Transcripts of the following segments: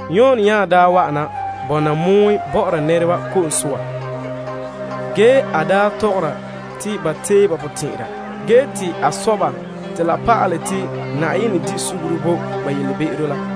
Yon daa wa'ana bɔna pɔgɔtia bɔ'ɔra nɛreba ko'om soa ge tɔgɔra te ba tee ba potɛn'ɛra ge te a sɔ ba te la pa'alɛ te Yenɛ bahɛ ba be'em bo ba.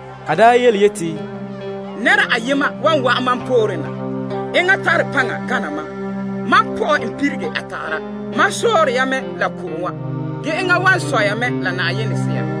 A daa yeti, Nɛra ayema wan wa'an mam poore na ge enŋa tare paŋa gana mam. Mam pɔ'ɛ n pirege a tagara. Mam sɔɔre ya mɛ la ko'om wa ge enŋa wan sɔ ya mɛ la Yenɛ Sea.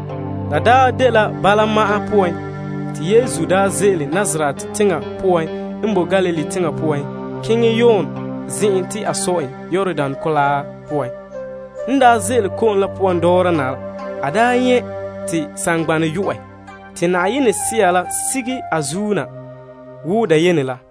La daa dela bala ma'an poan, te Yesu ze'ele Nazaret teŋa poan n boe Galilee teŋa poan keŋɛ Yon zen'an te a sɔ en Yordan Kolaa la poan. En ze'ele ko'om la poan dɔɔra na la a nyɛ' te saŋgbanɛ yo'ɛ, te Sea la sigera a zuo na wo dayene la.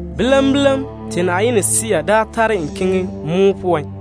Bilam bilam, te Yenɛ Sea la tare en keŋɛ pɔgɔtia poan.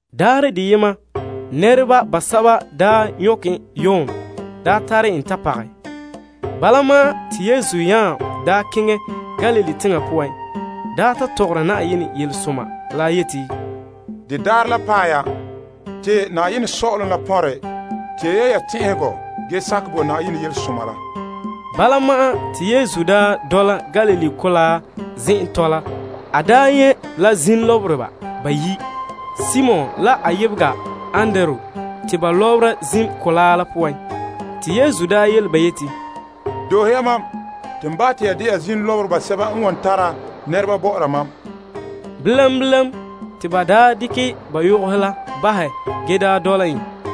Pooren to ban daa nyɔkɛ Yon tare en ta pagɛ en, te Yesu nya keŋɛ Galilee teŋa poan daa ta tɔgɔra Yenɛ yelesoma la yeti, De daarɛ la paɛ ya te Yenɛ Sɔ'ɔlom la pɔnrɛ. Tee ya ya potɛn'ɛra ge sakɛ bo Yenɛ Yelesoma la. Bala ma'an, te Yesu n dole Galilee mɔgɔrɛ zen'en tɔla la, a nyɛ' la zim lɔbereba bayi', Simon, la a yebega Andrew. Ba tare la yoka lɔbera zim mɔgɔrɛ la poan. Yesu yele ba yeti, Doohe ya mam, te n bahɛ te ya de'a zim lɔbereba sɛba n wan tara nɛreba bɔ'ɔra mam. Bilam bilam, te ba dekɛ ba yogohe la bahɛ ge dɔla en.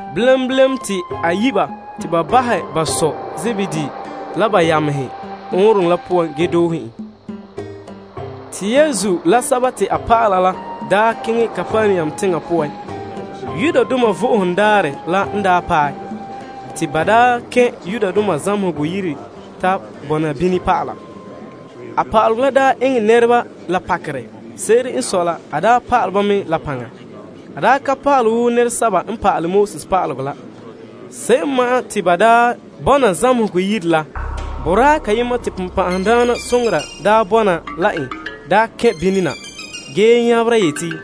Bilam bilam, te a yi' ba te ba bahɛ ba sɔ Zebedee la ba yamehe ɔɔnrɔŋɔ la poan ge doohe en. Yesu la a dɔlɔba la daa keŋɛ Kapernaum teŋa poan. Vo'ohogo Daarɛ la n paɛ, te ba kɛn' zamehegɔ yire te a bɔna bini pa'ala. A pa'alegɔ la eŋɛ nɛreba la pakerɛ. Se'ere n sɔe la, a pa'alɛ ba mɛ la paŋa. A ka pa'alɛ wo nɛresɛba n pa'alɛ pa'alegɔ la. Se'em ma'an te ba bɔna zamehegɔ yire la, boraa kayema te bonbɛ'ɛhe bɔna la n kɛn' bini na ge nyabera yeti,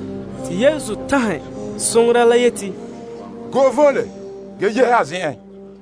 Yesu tanhɛ bonbe'a la yeti, Go'e voole, ge yehe a zen'en.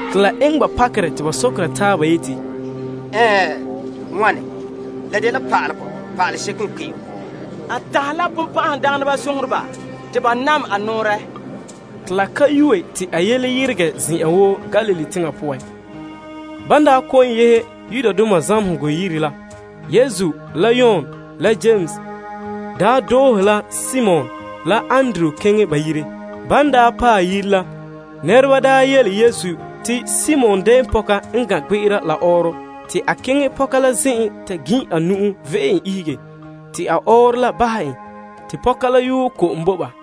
La eŋɛ ba pakerɛ te ba sɔkera taaba yeti, Bene n wana? La dela pa'ale paalega seko n kpe'em. A tanhɛ la bonbɛ'ɛhe, te ba nam a nɔɔrɛ. Te la ka yue te a yele yeregɛ zen'an woo Galilee teŋa poan. Ban daa kɔ'ɔn yehe zamehegɔ yire la, Yesu la Yon la Yames doohe la Simon la Andrew keŋɛ ba yire. Ba yele Yesu te Simon dɛɛnpɔka n gan' gbe'era la ɔɔrɔ. Te a keŋɛ pɔka la zen'en ta gin' a nu'o vi'e en ihege te a ɔɔrɔ la bahɛ en. Ge te a la yuɛ ko'om bo ba.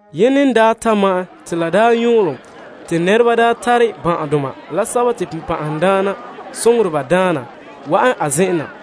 Yene n ta ma'ɛn, te nɛreba tare ban'ahedoma la sɛba te bonbɛ'ɛhe daana, wa'an a zen'en na,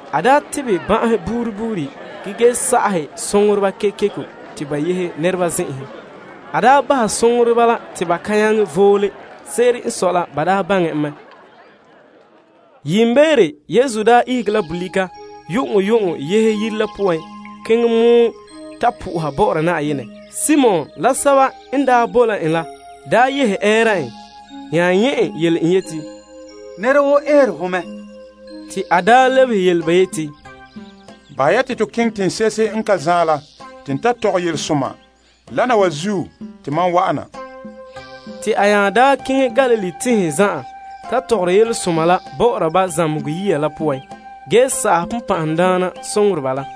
A tebɛ ban'ahe buuri buuri ge sa'ahɛ bonbɛ'ɛhe kekeko te ba yehe nɛreba zen'enhe. A bahɛ bonbɛ'ɛhe la te ba kan nyaŋɛ voole. Se'ere n sɔe la, ba baŋɛ en. Yiimbeere, Yesu daa ihege la bolika yu'uŋyu'uŋɔ yehe yire la poan keŋɛ mɔen ta soha Yenɛ. Simon, la sɛba n boe la en la yehe ɛɛra en, nya nyɛ' en ge yele en yeti, Nɛra woo eere ho mɛ. Te a lebehe yele ba yeti, Bahɛ ya te to keŋɛ teŋse'ehe n ka zaen la te n ta mɔɔlɛ yelesoma. Wana wa zuo te mam wa'ana. Te a nya keŋɛ Galilee teŋhe zan'an ta mɔɔla Yelesoma la bɔ'ɔra ba zamehegɔ yiya la poan ge sa'aha bonbɛ'ɛhe la.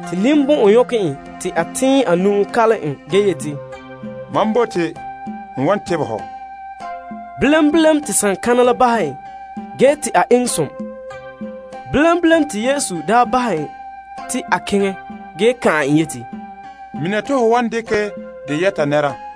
Te ninbɔn'ɔn nyɔkɛ en te Yesu tɛɛn a nu'o kalom en ge yeti, Mam bote. N wan tebɛ ho. Bilam bilam, te konkom la bahɛ en ge te a eŋɛ som te Yesu daa bahɛ te a keŋɛ ge kan'an en yeti, Mina te ho wan dekɛ dɛ yɛta nɛra.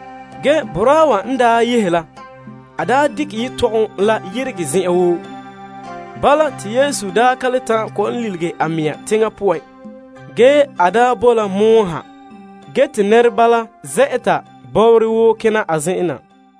Ge, boraa wa daa yehe la dekɛ yetɔgom la yeregɛ zen'an woo. Bala, te Yesu ka le ta'an kɔ'ɔn lilige a mɛŋa teŋa poan, ge a boe la yeŋa pɔgɔtia poan. Ge te nɛreba la zɛ'ɛta bɔbɔrɛ woo kena a zen'en na.